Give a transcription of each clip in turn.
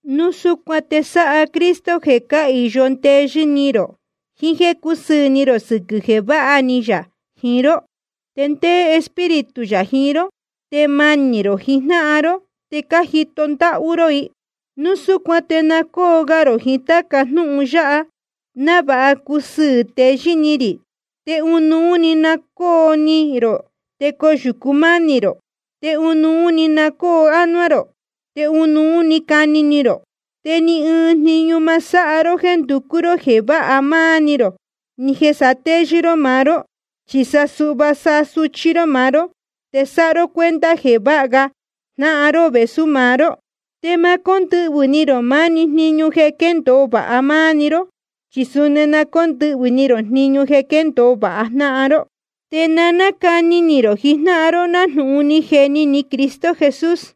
Núu súcuan te sáha Cristo jeē cáhīyo ndeyɨ́ ni rō, jiín jéē cúsɨɨ̄ ni rō sɨquɨ̄ jeē váha ni yā jiín ró. Te ndéé Espíritu yā jiín ró, te manī rō jiín jnáhan ró, te cájito ndáhú ró i. Núu súcuan te na cócu ga rō jiín táca jnúhun yáha, návāha cusɨɨ̄ teyɨ́ ni rī. Te ɨnuú‑ni na cóo ni rō, te coyūcu mánī rō, te ɨnuú na cóo ánuá rō, te ɨnuú cani ni rō. Te ni ɨɨn jniñu ma sáha ró jéē nducú ró jeē váha máá‑ni ró, ni jeē satéyɨ́ ró maá ró. Chi sa suhva sáha suchí ró maá ró, te sáha ró cuenta jeē váha ga jnáhan ró vēsú maá ró. Te ma cóndɨhvɨ̄ ni rō maá‑ni jniñu jeē quéndōo vāha máá‑ni ró, chi suni na cóndɨhvɨ̄ ni rō jniñu jeē quéndōo vāha jnáhan ró. Te na cáni ni rō jijnáhan ró nájnūhun ni jeni ni Cristo Jesús.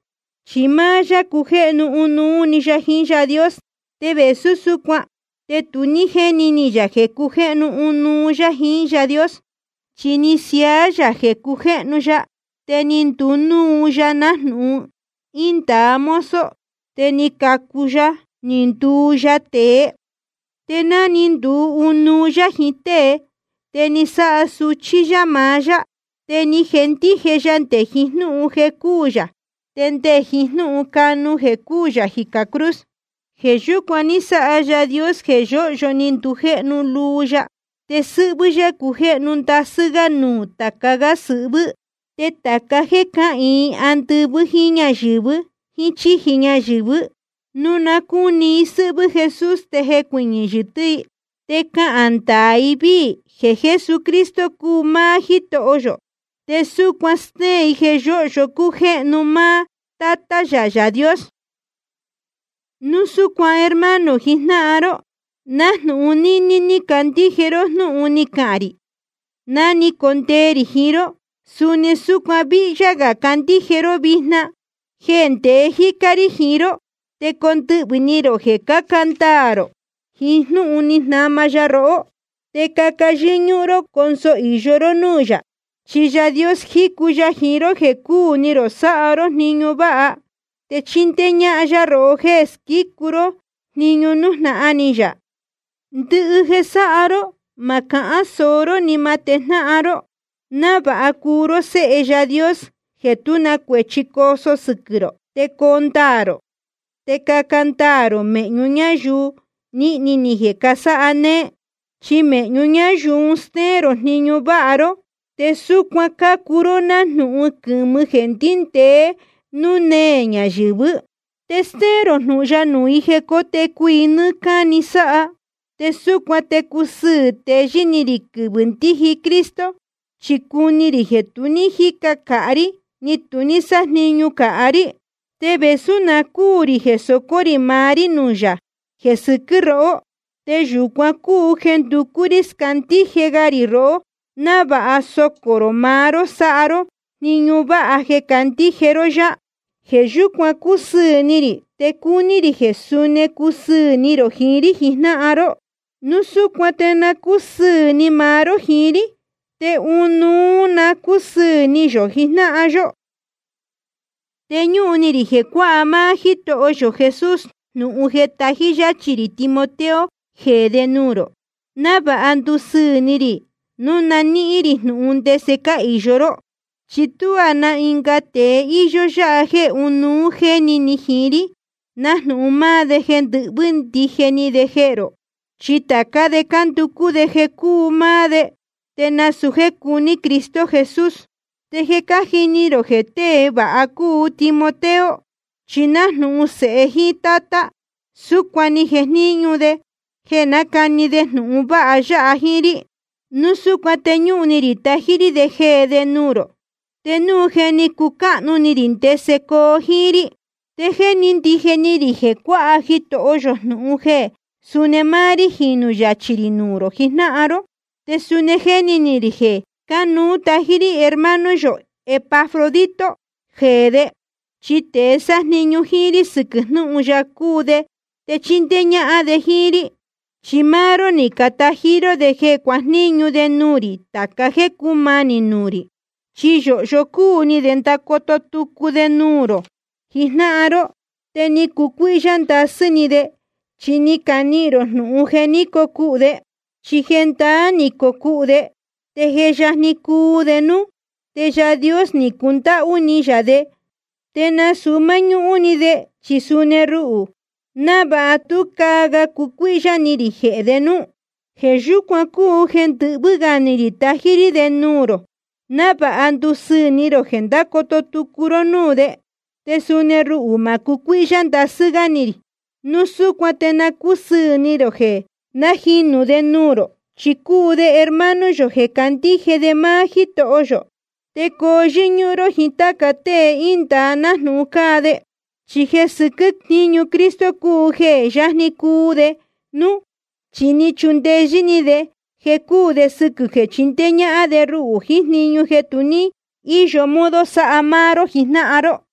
Chi máá yá cujéhnu ɨnuú yá jiín Yaā Dios, te vēsú súcuan te tu ní jéni ni yā jeē cujéhnu ɨnuú yá jiín Yaā Dios. Chi ni siaá yā jeē cujéhnu ya, te ni nduu ya nájnūhun índāa mozo, te ni cacu ya ni nduu ya tēe. Te ná ni nduu ɨnuú yá jiín tée, te ni sáha suchí yá maá yá. Te ni jendije ya nde jiín jnúhun jeē cúū yā, te nde jiín jnúhun canu jeē cúū yā jicā cruz. Jeē yúcuan ní sáha Yaā Dios jeē yóhyo ni ndujéhnu luu ya, te sɨ́hvɨ́ yá cujéhnu ndasɨ́ gá nuū tāca gá sɨhvɨ́. Te tāca jéē cáhīin andɨvɨ́ jíín ñáyɨ̄vɨ jíín chíji ñayɨ̄vɨ́, núu na cúni i sɨ́hvɨ́ Jesús te jecuɨñɨ̄ yɨtɨ́ i. Te cahān ndaā ndɨvii i jeē Jesucristo cúu máá Jítoho. Te súcuan stéén i jeē yóhyo cújéhnu máá Tátá yā Yaā Dios. Núu súcuan hermano jijnáhan ró, nájnūhun níní ní cajendije ró jnúhun ni cahān rī ná ni condee rī jiín ró, suni súcuan víhyá gā cuandije ró vijna jeē ndeé jícá rí jiín ró. Te condɨhvɨ̄ ni rō jeē caca ndaā rō jiín jnúhun ní jnama ya rohó, te caca yɨ́ñúhún ró conso īyo ró núū yā. Chi Yaā Dios jícu ya jiín ró jeē cúu ni rō sáha ró jniñu váha, te chíndéé ñáhán yá rohó jéē squícu ró jniñu nújnahan ni yā. Ndɨhɨ jeē sáha ró, ma cahán sōo ró, ni ma tejnáhan ró, návāha cuu ró séhe Yaā Dios jeē tú na cuēchi coo sɨquɨ̄ rō te coo ndaā rō. Te caca ndoo ró méhñu ñáyuu nīhni ni jeē casáha néé. Chi mēhñu ñáyuu un stéén rō jniñu váha ró, te súcuan cácuu ró nájnūhun quɨ̄mɨ jeē ndíndēe núū néē ñayɨ̄vɨ́. Te stéén rō jnūhun ya nuū i jeē cótecu i nɨ́ɨ́ cáni sáha. Te súcuan te cusɨɨ̄ teyɨ́ ni rī quɨvɨ̄ ndíji Cristo, chi cuni rī jeē tu ní jíca cāhá rí, ni tu ní sájniñu cāhá rí. Te vēsú na cúū rī jeē socō rī maá rí nuū yā jeē sɨquɨ́ rohó, te yūcuan cúu jeē nducú rí scandíje ga rī rohó, návāha socō rō maá ró sáha ró jniñu váha jeē cácandíje ró yá. Jeē yúcuan cúsɨɨ̄ ni rī, te cúní rī jeē suni cusɨɨ̄ ni rō jiín rí jijnáhan ró. Núu súcuan te na cúsɨɨ̄ ni maá ró jiín rí, te ɨnuú na cúsɨɨ̄ ni yō jijnáhan yó. Te ñúhun ni rī jeē cuáha máá Jítoho yō Jesús jnūhun jeē tají yáchī rī Timoteo jeē de nuū rō, návāha ndusɨɨ̄ ni rī núu na níhín rī jnūhun ndese cáhīyo ró. Chi tuá na ɨnga tēe íyó yáha jéē ɨnuú jéni ni jiín rí, nájnūhun máá de jeē ndɨhvɨ́ ndije ni de jehē rō. Chi tācá de cánducú de jeē cúu máá de, te nasūu jéē cuní Cristo Jesús. Te je cájini rō jeē tée vāha cúu Timoteo. Chi nájnūhun sēhe jíín tátá, súcuan ni jejníñu de jeē nácani de jnūhun vāha ya jiín rí. Núu súcuan te ñúhun ni rī tají rí de jeē de nuū rō, te núu je ni cucáhnu ni rī ndese coo jíín rí. Te jéni ndije ni rī jeē cuāha Jitoho yō jnūhun jeē suni máá rí jinū yachī rī nuū rō jijnáhan ró. Te suni jéni ni rī jeē cánuú tají rí hermano yō Epafrodito jeē de, chi tēe sájniñu jíín rí sɨquɨ̄ jnúhun ya cúu de te chíndéé ñájnáhan de jíín rí. Chi máá ró ni catají ró de jeē cuajníñu de nuū rī tāca jéē cúmanī nuū rī. Chi yōhyo cúu ni de ndacoto tucu de nuū rō jijnáhan ró. Te ni cucuíhyá ndasɨ́ ni de, chi ni canihīn rō jnūhun jeē ní cocuhū de. Chi jendaá ni cocuhū de, te je yajni cuu de núú. Te Yaā Dios ni cundáhú ni yā de, te nasūu máñúhún‑ni de, chi suni ruhū, návāha tú caa ga cucuíhyá ni rī jehē de núú. Jeē yúcuan cúu jeē ndɨhvɨ́ gā ni rī tají rí de nuū rō, návāha ndusɨɨ̄ ni rō jeē ndácoto tucu ró núū de. Te suni ruhū ma cucuíhyá ndasɨ́ gá ni rī. Núu súcuan te na cúsɨɨ̄ ni rō jeē nájinū de nuū rō, chi cúu de hermano yō jeē candíje de maá Jítoho yō. Te coo yɨ́ñúhún ró jíín táca tée índāa nájnūhun cáa de. Chi jeē sɨquɨ́ jniñu Cristo cúu jeē jé yajni cuu de núú. Chi ni chundeyɨ́ ni de jeē cúū de sɨquɨ̄ jeē chindéé ñáhán de ruhū jiín jniñu jeē tu ní íyo modo sáha máá ró jijnáhan ró.